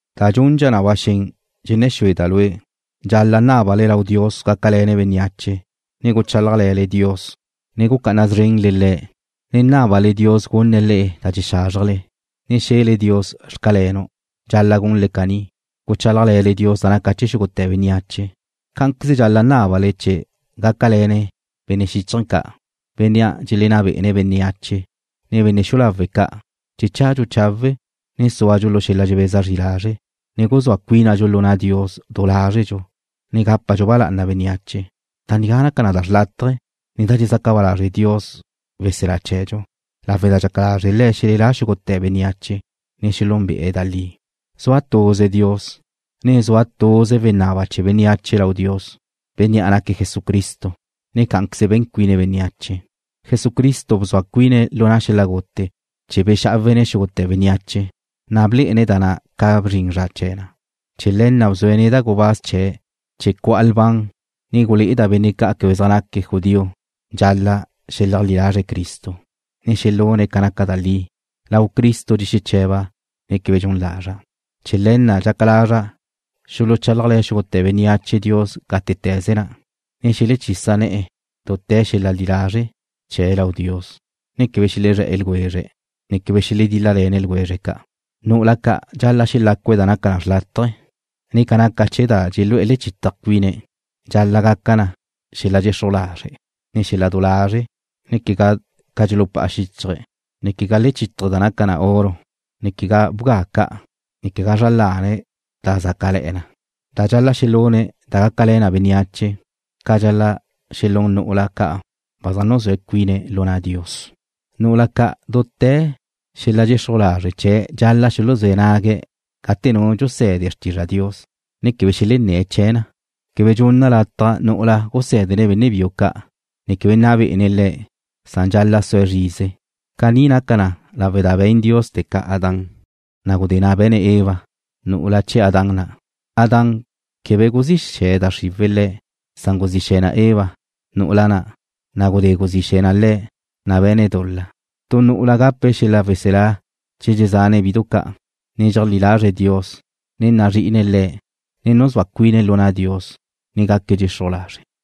Da dxundxa na ba xen dxenné̱ xúeda' lue', dxal-la' nábale lau Dios gácale̱ne̱' bénneache, ne guchálajle̱le Dios, ne gucá'ana szrenle Le̱', ne nábale Dios gunne̱' le'e da dxexázrjele, ne xe̱le Dios: Xcalenu'. Dxal-la' gunle caní, guchálajle̱le Dios da naca na chee̱ xúgute̱ bénneache. Cá'anqueze dxal-la' nábale Le̱' gácale̱ne̱' benne' xichje ca', benne' dxelenná be'ene̱' bénneache, ne benne' xu'u lawe' ca' chee̱ chadxu chawe', ne súadxu lu xel-la dxebeza zri lazre', ne guzúa cuínadxu lu na' Dios du lázredxu, ne gápadxu ba lá'ana bénneache. Da nigá naca na xrlátaje, ne da dxezaca ba lazre' Dios, weselá chee̱dxu, lawe' da dxaca lazre' Le̱' xelelá xúgute̱ bénneache, ne xelúnbe'e̱ da li. Zua tuze Dios, ne zua tuze wenaba chee̱ bénneache lau Dios, Bénnea' naque̱' Jesucristo, ne cá'anqueze be̱n cuine̱' bénneache. Jesucristo bzua cuine̱' lu xel-la gute chee̱ bexá'awe̱' xúgute̱ bénneache, na' blé'ene̱' da na' ca bzrin zra chee̱ na. Chee̱ le̱ na' bzue̱' neda' gubáz chee̱' chee̱ cu'a lban, ne gulé'eda' benne' ca' quebe zaj naque̱' judío dxal-la' xeleajlí lazre̱' Cristo, ne xelune̱' ca naca da li. Lau Cristo dxexeche̱ba', ne quebe dxun lazra'. Chee̱ le̱ na' dxaca lazra' xuluchálajle̱ xúgute̱ bénneache Dios gátete̱ze na', ne xelechisa ne̱'e̱ dute̱ xel-la li lazre' chee̱' lau Dios, ne quebe xelezré̱'e̱ ljwezre̱', ne quebe xeledíl-lale̱ne̱' ljwezre' ca'. Nu'ula ca' dxal-la' xelácue̱' da naca xlátaje̱, ne ca naca chee̱ da dxelúe lechítaje̱ cuine̱' dxal-la' gaca na xel-la dxexruj lazre', ne xel-la du lazre', ne quegá ca dxulupá'a xíchaje̱', ne quegá lechítaje̱ da naca na oro, ne quegá bga ca', ne quegá zra lane̱' da zácale̱'e̱ na. Dxal-la' xelune̱' da gácale̱ na bénneache, ca dxal-la' xelún nu'ula ca' ba zaj nuzúa cuine̱' lu na' Dios. Nu'ula ca' dute̱ lu xel-la dxexruj lazre' chee̱' dxal-la' xuluzé̱ nague̱' gate nu dxuse̱de xrtizra Dios, ne quebe xelenné̱' chee̱ na. Quebe dxunna' lataj nu'ula gusé̱dene̱' benne' biu ca', ne quebe nna be'ene̱' le̱', san dxal-la' sue' zrize. Caní naca na lawe' da be̱n Dios teca Adán, na' gudé na' be̱ne̱' Eva, nu'ula chee̱ Adán na'. Adán, quebe guzí xe̱ da xriwe̱' le̱', san guzí xe̱ na Eva, nu'ula na', na' gudé guzí xe̱ na le̱', na' be̱ne̱' dul-la. Tu nu'ula gape̱' xel-la weselá che dxezane̱' bidu ca', ne cheajlí lazre̱' Dios, ne nazri'ine̱' Le̱', ne nuzúa cuine̱' lu na' Dios, ne gaque̱' dxexruj lazre'.